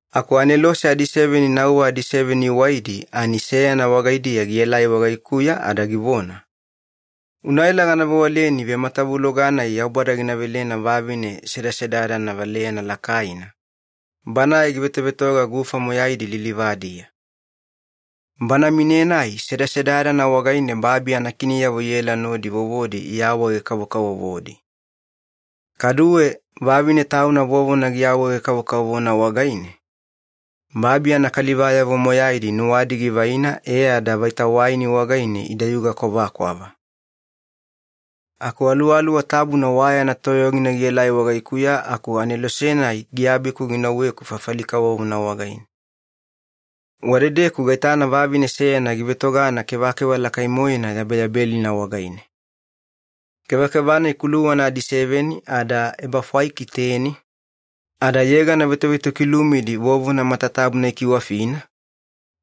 Aku anelose adiseveni nauwa adiseveni iwaidi, ani seyana wagaidiya gielai wagaikuya ada givona, “Unaela gana vewaleni vematavuloga-nai Yaubada gina velena vavine sedasedadana valeyana lakaina, banae givetovetoga gufa moyaidi lilivadiya. Bana mine-nai sedasedadana wagaine babi anakiniyavo iela nodi vovodi iawaege-kavokavovodi. Kaduwe vavine tauna vovona iawaege-kavokavovona wagaine, babi anakalivayavo moyaidi nuwadi givaina e ada vaita waini wagaine idayuga kwavakwava.” Aku Aluwaluwa Tabuna wa yana toyogina gielai wagaikuya aku anelose-nai giabiku ginauweku fafali kavovona wagaine. Wadedeku gaitana vavine seyana givetogana kevakeva lakai-moena yabeyabelina wagaine. Kevakeva-nai kuluwana adiseveni ada ebafwaiki teni, ada yegana vetovetokilumidi vovona matatabuna ikiwafina,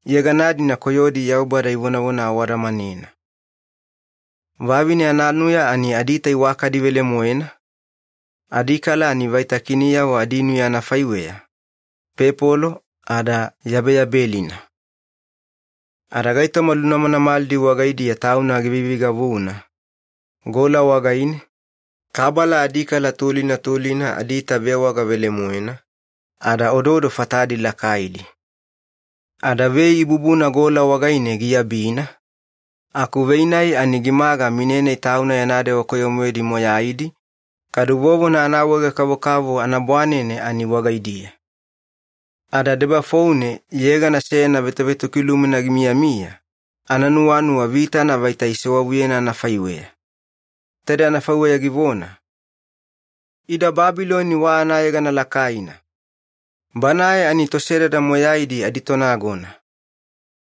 yegana-dina koyodi Yaubada ivonavona awadamanena. Vavine ananuya ani adiita iwakadi velemoena, adikala ani vaita kiniyavo adinuya anafaiweya, pepolo ada yabeyabelina. Ada gaitoma lunamanamalidi wagaidiya tauna giveiveigavuna, gola wagaine, kabala adikala tulina tulina adiita vewaga velemoena, ada ododo fatadi lakaidi. Ada vei ibubuna gola wagaine giabina, aku vei-nai ani gimaga mine-nai tauna yana dewa koyo-moedi moyaidi, kadu vovona anaawaege-kavokavovo anabwanene ani wagaidiya. Ada debafoune yegana seyana vetovetokilumina gimiyamiya, ananuwanuwa vitana vaita isewavuyena anafaiweya. Taide anafaiweya givona, Ida Babiloni wa anayegana lakaina! Banae ani tosedada moyaidi aditonagona.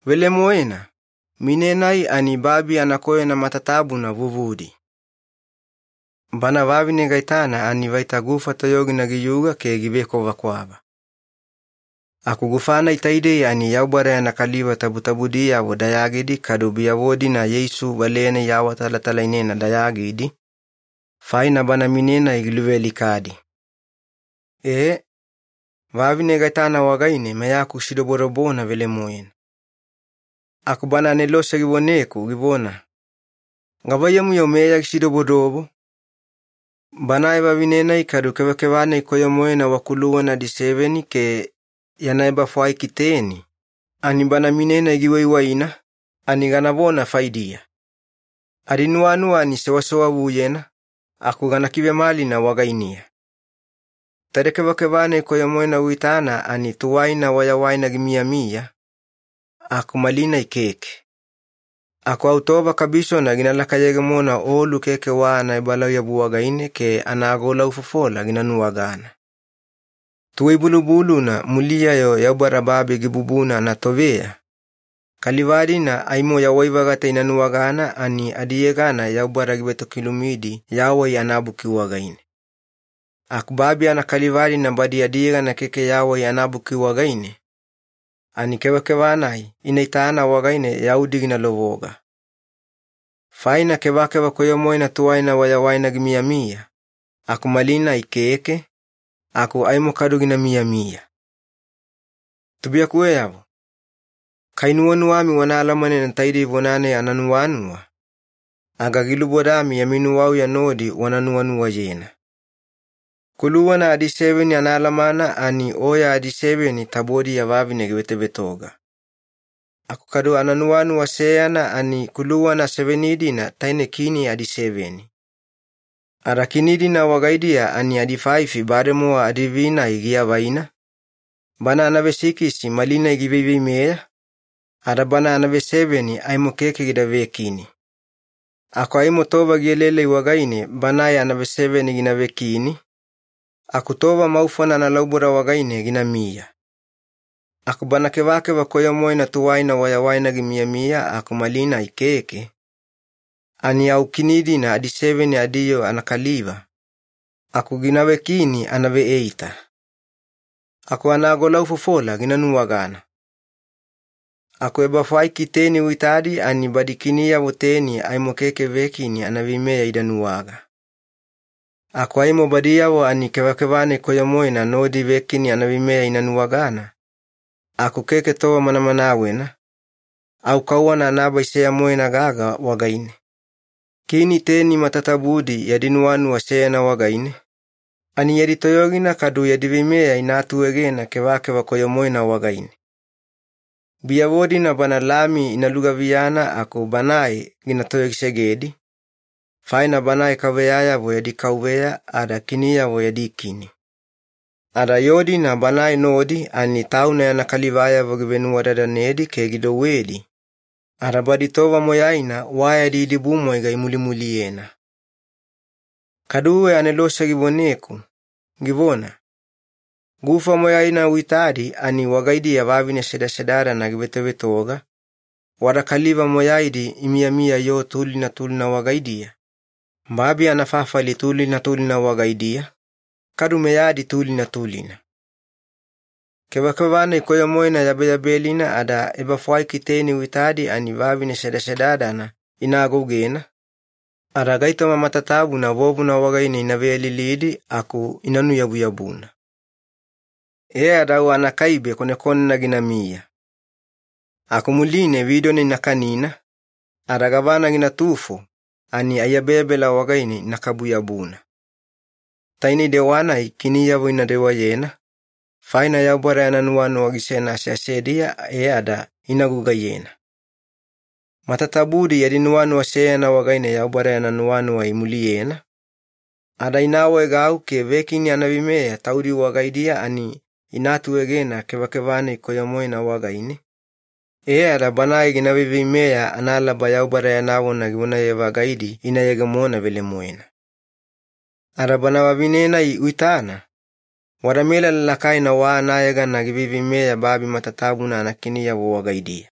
Velemoena, mine-nai ani babi anakoyona matatabuna vuvudi. Bana vavine gaitana ani vaita gufa toyogina giyuga ke givekwavakwava. Aku gufa-nai taidei ani Yaubada yana kaliva tabutabudiyavo dayagidi kadu biyavo-dina Yeisu valeyana iawaawatalatalainena dayagidi, faina bana mine-nai giluvealikadi. Ee, vavine gaitana wagaine meyaku gisidobodobona velemoena. Aku bana anelose givoneku givona, “Gavaiyamu-yo meya gisidobodobo? Banae vavine-nai kadu kevakeva-nai koyo-moena wa kuluwana adiseveni ke yana ebafwaiki teni, ani bana mine-nai giwaiwaina, ani ganavona faidiya. Adinuwanuwa ani sewasewavuyena, aku gana kivemalina wagainiya. Taide kevakeva-nai koyo-moena uitana ani tuwaina wayawaina gimiyamiya, aku malinai keke. Aku au tova kabisona gina lakayegemona olu keke wa anaebalauyabu wagaine ke anaagolaufofola gina nuwagana. Tuwai-bulubuluna muliya-yo Yaubada babi gibubuna anatoveya, kaliva-dina aimo yawai-vagata ina nuwagana ani adiyegana Yaubada givetokilumidi Yawai anaBuki wagaine. Aku babi anakaliva-dina badi adiyegana keke Yawai anaBuki wagaine, ani kevakeva-nai ina itana wagaine yaudi gina lovoga. Faina kevakeva koyo-moena tuwaina wayawaina gimiyamiya, aku malinai keke, aku aimo kadu gina miyamiya. “Tubuiyakuweyavo, kai nuwanuwami wana alamanena taidei vona-nai ananuwanuwa, aga gilubodami yami nuwauya nodi wana nuwanuwayena. Kuluwana adiseveni anaalamana ani oya adiseveni tabodiya vavine givetovetoga. Aku kadu ananuwanuwa seyana, ani kuluwana seveni-dina taine kini adiseveni. Ada kini-dina wagaidiya ani adifaifi bademowa adiivi-nai giavaina, bana anavesikisi malinai giveiveimeya, ada bana anaveseveni aimo keke gida vekini. Aku aimo tova gielaelai wagaine banae anaveseveni gina vekini, aku tova maufona analauboda wagaine ginamiya. Aku bana kevakeva koyo-moena tuwaina wayawaina gimiyamiya aku malinai keke, ani au kini-dina adiveseveni adiyoo anakaliva, aku gina vekini anaveeita. Aku anaagolaufofola gina nuwagana. Aku ebafwaiki teni uitadi ani badi kiniyavo teni aimo keke vekini anaveimeya ida nuwaga. Aku aimo badiyavo ani kevakeva-nai koyo-moena nodi vekini anaveimeya ina nuwagana, aku keke tova manamanawena, au kauwana anabai seya-moena gaga wagaine. Kini teni matatabudi yadi nuwanuwa seyana wagaine, ani yadi toyogina kadu yadi veimeya ina atuegena kevakeva koyo-moena wagaine. Biyavo-dina Bana Lami ina lugaviyana aku Banae gina toyogisegedi, faina Banae kauveyayavo yadi Kauveya ada kiniyavo yadi Kini. Ada yoo-dina Banae nodi ani Tauna yana kalivayavo givenuwadadanedi ke gidouwedi, ada badi tova moyaina wa yadi idibumwaiga imulimuliyena.” Kaduwe anelose givoneku, givona, “Gufa moyaina uitadi ani wagaidiya vavine sedasedadana givetovetoga, wada kaliva moyaidi imiyamiya yoo tulina tulina wagaidiya, babi anafafali tulina tulina wagaidiya, kadu meyadi tulina tulina. Kevakeva-nai koyo-moena yabeyabelina ada ebafwaiki teni uitadi ani vavine sedasedadana ina agougena, ada gaitoma matatabuna vovona wagaine ina veyalilidi aku ina nuyabuyabuna. E ada au anakaibe konekonena ginamiya. Aku muline vidona ina kanina, ada gavana ginatufo ani aiyabeyabela wagaine inakabu-yabuna. Tainei dewa-nai kiniyavo ina dewayena, faina Yaubada yana nuwanuwa gisena aseasediya e ada ina gugaiyena. Matatabudi yadi nuwanuwa seyana wagaine Yaubada yana nuwanuwa imuliyena, ada ina awaegau ke vekini anaveimeya taudi wagaidiya ani ina atuegena kevakeva-nai koyo-moena wagaine, e ada banae gina veiveimeya analaba Yaubada yana vona givonaye-vagaidi ina yegemona velemoena. Ada bana vavine-nai uitana, wada melala lakaina wa anayegana giveiveimeya babi matatabuna anakiniyavo wagaidiya.”